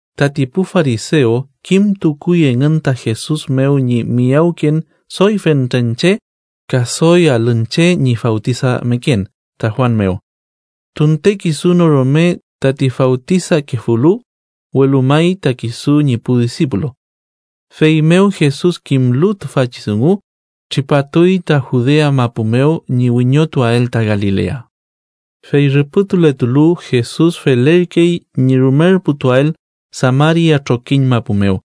Tati pu farisew kimtukuy engün ta Jesus mew ñi miyawken doy fentren che ka doy alün che ñi fawtisameken ta Juan mew. Tunte kisu no rume tati fawtisakefulu, welu may ta kisu ñi pu disipulu. Feymew Jesus kimlu tüfachi dungu, tripatuy ta Judea mapu mew ñi wiñotuael ta Galilea. Fey rüpütuletulu, Jesus felerkey ñi rumerputuael Samaria trokiñ mapu mew.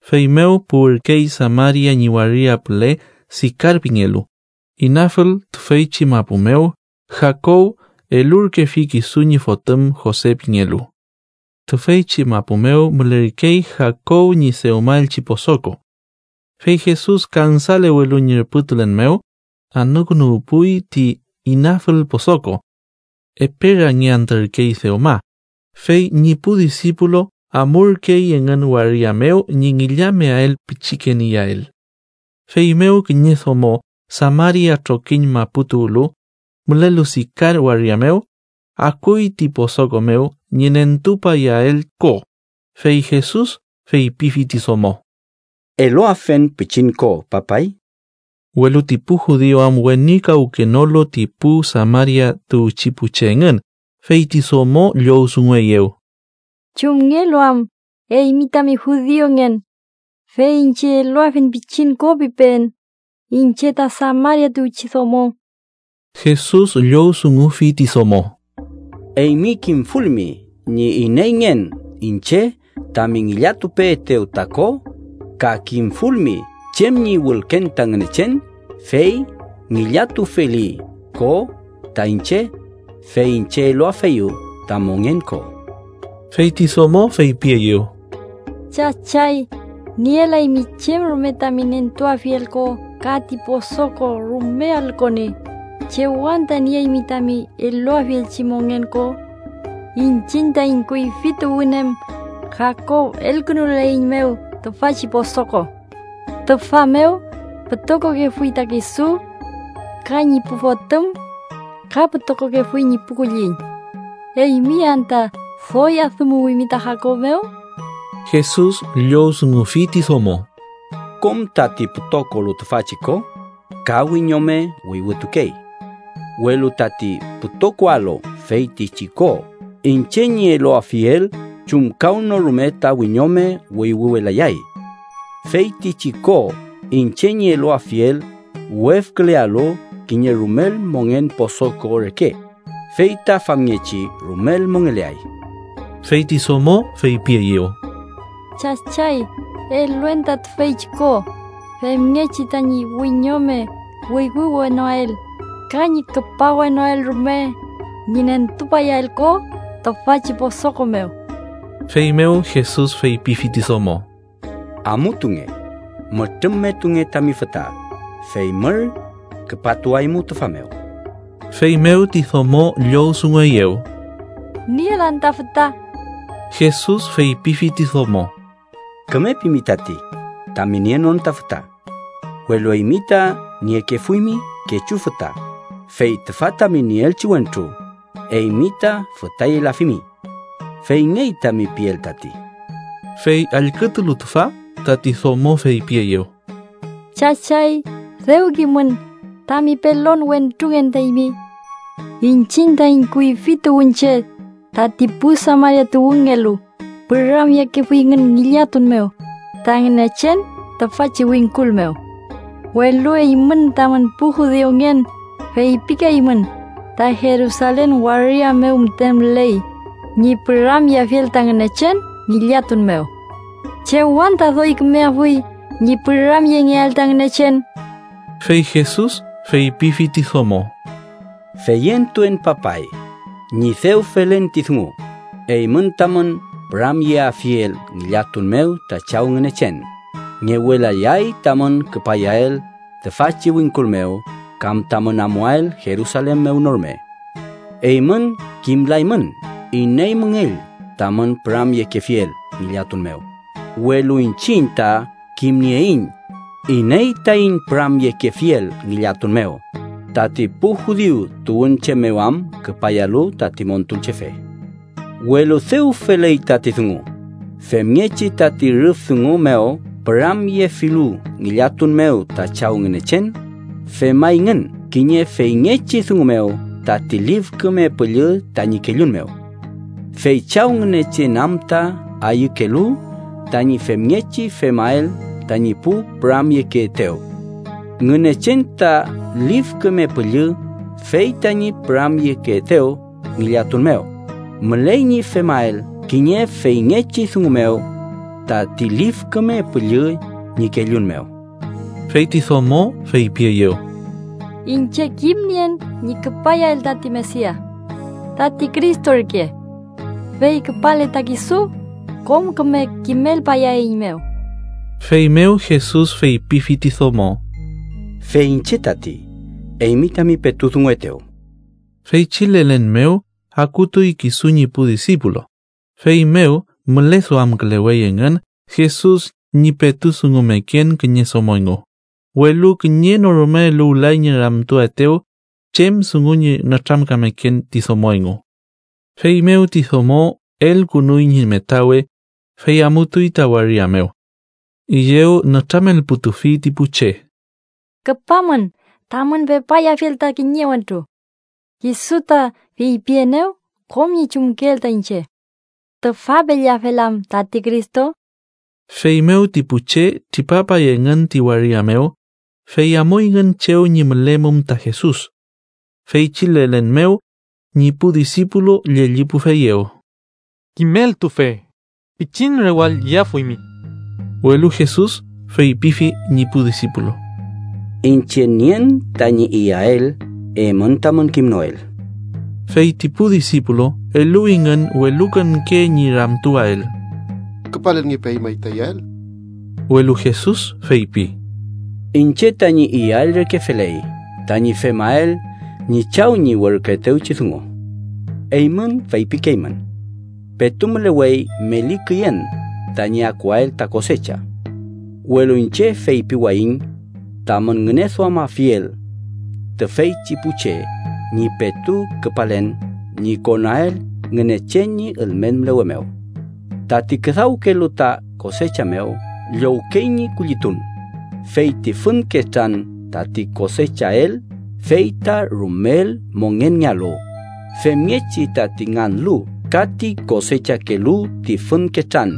Feymew puwürkey Samaria ñi waria püle Sikar pingelu, inafül tüfeychi mapu mew Jakob elurkefi kisu ñi fotüm Jose pingelu. Tüfeychi mapu mew mülerkey Jakob ñi dewmaelchi posoko. Fey Jesus kansalewelu ñi rüpütulen mew, anükünuwpuy ti inafül posoko. Epe rangiantürkey dewma. Fey ñi pu disipulu amurkey engün waria mew ñi ngillameael pichiken iyael. Feymew kiñe domo Samaria trokiñ mapu tuwlu, mülelu Sikar waria mew, akuy ti posoko mew ñi nentupayael ko, fey Jesus feypifi ti domo: —Eluafen pichin ko, papay. Welu ti pu judiu am wenikawkenolu ti pu Samaria tuwchi pu che engün, fey ti domo llowdungueyew: —¿Chumngelu am eymi tami judiungen, fey iñche ‘eluafen pichin ko’ pipeen, iñche ta Samaria tuwchi domo? Jesus llowdungufi ti domo: —Eymi kimfulmi ñi ineyngen iñche tami ngillatupeetew ta ko ka kimfulmi chem ñi wülken ta Ngünechen, fey ngillatufeli ko ta iñche, fey iñche eluafeyu ta mongen ko. Fey ti domo feypieyew: —Chachay, nielaymi chem rume tami nentuafiel ko ka ti posoko rume alü koni. ¿Chew anta nieymi tami eluafielchi mongen ko? Iñchiñ taiñ kuyfi tuwün em Jakob elkünuleiñmew tüfachi posoko. Tüfa mew pütokokefuy ta kisu ka ñi pu fotüm ka pütokokefuy ñi pu kulliñ. ¿Eymi anta doy adümuwimi ta Jakob mew? Jesus llowdungufi ti domo: —Kom tati pütokolu tüfachi ko, ka wiñome wüywütukey. Welu tati pütokoalu feytichi ko iñche ñi eluafiel, chumkawnorume ta wiñome wüywüwelayay. Feytichi ko iñche ñi eluafiel wefkülealu kiñe rumel mongen posoko reke, fey ta famngechi rumel mongeleay. Fey ti domo feypieyew: —Chachay, eluen ta tüfeychi ko, femngechi tañi wiñome wüywüwenoael ka ñi küpawenoael rume ñi nentupayael ko tüfachi posoko mew. Feymew Jesus feypifi ti domo: —Amutunge. Mütrümmetunge tami füta, fey mür küpatuaymu tüfa mew. Feymew ti domo llowdungueyew: —Nielan ta füta. Jesus feypifi ti domo: —Küme pimi tati tami nienon ta füta. Welu eymi ta niekefuymi kechu füta, fey tüfa tami nieelchi wentru, eymi ta fütayelafimi. Feyngey tami piel tati. Fey allkütulu tüfa, tati domo feypieyew: —Chachay, dew kimün tami pelon wentrungen ta eymi. Iñchiñ taiñ kuyfi tuwünche, tati pu Samaria tuwünngelu, püramyekefuyngün ngillatun mew ta Ngünechen tüfachi wingkul mew. Welu eymün tamün pu judiungen feypikeymün ta Jerusalen waria mew müten müley ñi püramyeafiel ta Ngünechen ngillatun mew. ¿Chew anta doy kümeafuy ñi püramyengeael ta Ngünechen? Fey Jesus feypifi ti domo: —Feyentuen papay, ñi dew felen ti dungu, eymün tamün püramyeafiel ngillatun mew ta Chaw Ngünechen, ngewelayay tamün küpayael tüfachi wingkul mew kam tamün amuael Jerusalen mew no rume. Eymün kimlaymün iney müngell tamün püramyekefiel ngillatun mew, welu iñchiñ ta kimnieiñ iney taiñ püramyekefiel ngillatun mew, tati pu judiu tuwünche mew am küpayalu tati Montulchefe. Welu dew feley tati dungu, femngechi tati rüf dungu mew püramyefilu ngillatun mew ta Chaw Ngünechen, femayngün kiñe feyngechi dungu mew tati Lif Küme Püllü tañi kellun mew. Fey Chaw Ngünechen am ta ayükelu tañi femngechi femael tañi pu püramyekeetew. Ngünechen ta Lif Küme Püllü, fey tañi püramyekeetew ngillatun mew, müley ñi femael kiñe feyngechi dungu mew tati Lif Küme Püllü ñi kellun mew. Fey ti domo feypieyew: —Iñche kimnien ñi küpayael tati Mesia (tati Cristo ürke), fey küpale ta kisu, kom küme kimelpayaeiñmew. Feymew Jesus feypifi ti domo: —Fey iñche tati, eymi tami petu dunguetew. Feychi lelen mew akutuy kisu ñi pu disipulu, feymew müleduamkülewey engün Jesus ñi petu dungumeken kiñe domo engu. Welu kiñe no rume eluwlay ñi ramtuaetew chem dungu ñi nütramkameken ti domo engu. Feymew ti domo elkünuy ñi metawe, fey amutuy ta waria mew. Üyew nütramelputufi ti pu che: —Küpamün tamün pepayafiel ta kiñe wentru. Kisu ta feypienew kom ñi chumkeel ta iñche. ¿Tüfapelleafel am tati Cristo? Feymew ti pu che tripapay engün ti waria mew, fey amuyngün chew ñi mülemum ta Jesus. Feychi lelen mew, ñi pu disipulu llellipufeyew: —Kimeltufe, pichin rewall iyafuymi. Welu Jesus feypifi ñi pu disipulu: —Iñche nien tañi iyael eymün tamün kimnoel. Fey ti pu disipulu eluwingün welukonke ñi ramtuwael: —¿Küpalelngepemay ta iyael? Welu Jesus feypi: —Iñche tañi iyael reke feley tañi femael ñi Chaw ñi werküetewchi dungu. Eymün feypikeymün: ‘Petu mülewey meli küyen tañi akuael ta kosecha.’ Welu iñche feypiwayiñ tamün ngüneduamafiel tüfeychi pu che ñi petu küpalen ñi konael Ngünechen ñi ülmen mülewe mew. Tati küdawkelu ta kosecha mew llowkey ñi kullitun, fey ti fün ketran tati kosechael fey ta rumel mongenngealu, femngechi tati nganlu ka ti kosechakelu ti fün ketran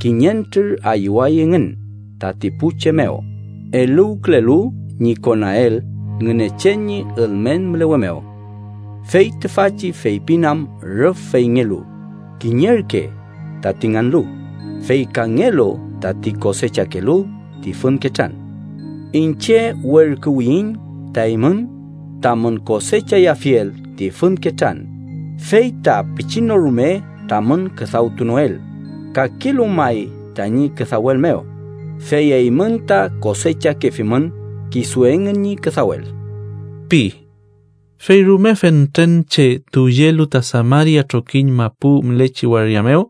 kiñentrür ayüway engün tati pu che mew eluwkülelu ñi konael Ngünechen ñi ülmen mülewe mew. Fey tüfachi feypin am rüf feyngelu: ‘Kiñerke tati nganlu, fey kangelu tati kosechakelu ti fün ketran.’ Iñche werküwiyiñ ta eymün tamün kosechayafiel ti fün ketran, fey ta pichin no rume tamün küdawtunoel; kakelu may tañi küdawel mew, fey eymün ta kosechakefimün kisu engün ñi küdawel ―pi. Fey rume fentren che tuwyelu ta Samaria trokiñ mapu mülechi waria mew,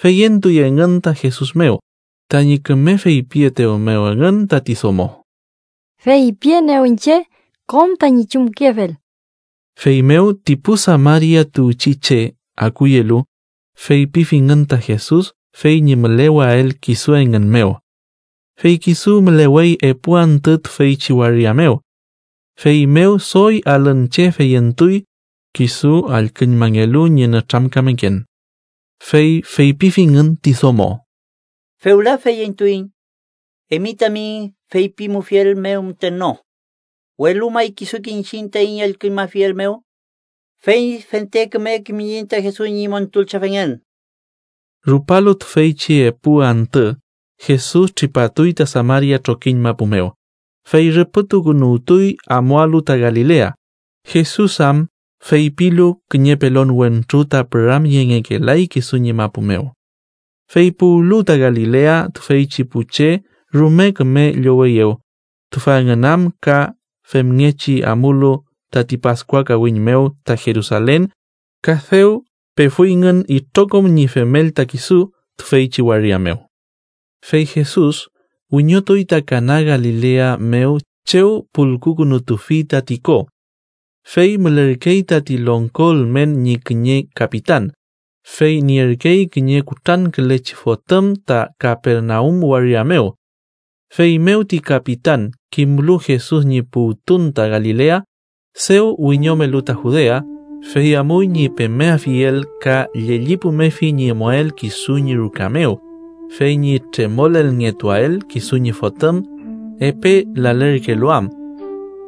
feyentuy engün ta Jesus mew, tañi küme feypietew mew engün tati domo: “Feypienew iñche kom tañi chumkefel.” Feymew, ti pu Samaria tuwchi che akuyelu, feypifingün ta Jesus fey ñi müleweael kisu engün mew. Fey kisu mülewey epu antü tüfeychi waria mew. Feymew doy alün che feyentuy, kisu allküñmangelu ñi nütramkameken. Fey feypifingün ti domo: —Fewla feyentuiñ eymi tami feypimufiel mew müten no, welu may kisuke iñchiñ taiñ allküñmafiel mew, fey fente küme kimiyiñ ta Jesus ñi Montulchefengen. Rupalu tüfeychi epu antü, Jesus tripatuy ta Samaria trokiñ mapu mew, fey rüpütukünuwtuy amualu ta Galilea, Jesus am feypilu kiñe pelon wentru ta püramyengekelay kisu ñi mapu mew. Fey puwlu ta Galilea, tüfeychi pu che rume küme lloweyew, tüfa engün am ka femngechi amulu tati Paskua kawiñ mew ta Jerusalen ka dew pefuyngün itrokom ñi femel ta kisu tüfeychi waria mew. Fey Jesus wiñotuy ta Kana Galilea mew chew pulkukünutufi tati ko. Fey mülerkey tati longko ülmen ñi kiñe kapitan, fey nierkey kiñe kutrankülechi fotüm ta Kapernaum waria mew. Feymew ti kapitan kimlu Jesus ñi puwtun ta Galilea, dew wiñomelu ta Judea, fey amuy ñi pemeafiel ka llellipumefi ñi amuael kisu ñi ruka mew, fey ñi tremolelngetuael kisu ñi fotüm, epe lalerkelu am.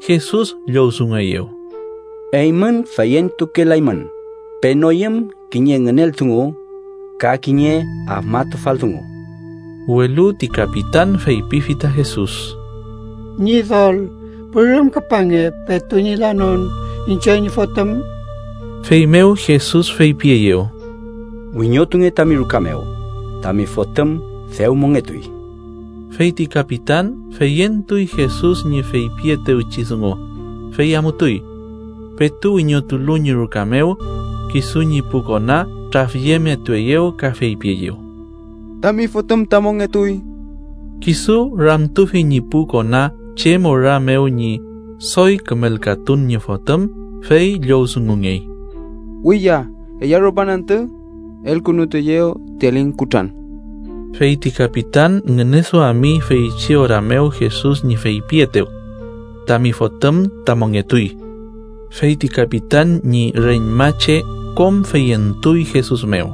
Jesus llowdungueyew: —Eymün feyentukelaymün, penoyüm kiñe ngünel dungu ka kiñe afmatufal dungu. Welu ti kapitan feypifi ta Jesus: —Ñidol, pürüm küpange petu ñi lanon iñche ñi fotüm. Feymew Jesus feypieyew: —Wiñotunge tami ruka mew, tami fotüm dew mongetuy. Fey ti kapitan feyentuy Jesus ñi feypietewchi dungu, fey amutuy. Petu wiñotulu ñi ruka mew, kisu ñi pu kona trafyemetueyew ka feypieyew: —¡Tami fotüm ta mongetuy! Kisu ramtufi ñi pu kona chem ora mew ñi doy kümelkatun ñi fotüm, fey llowdungungey: —Wiya ella rupan antü elkünutueyew ti aling kutran. Fey ti kapitan ngüneduami feychi ora mew Jesus ñi feypietew: “tami fotüm ta mongetuy”. Fey ti kapitan ñi reñmache kom feyentuy Jesus mew.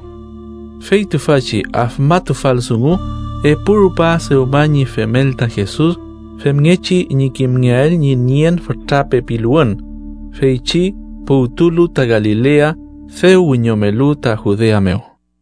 Fey tüfachi afmatufal dungu epu rupa dewma ñi femel ta Jesus femngechi ñi kimngeael ñi nien fütra pepiluwün feychi puwtulu ta Galilea dew wiñomelu ta Judea mew.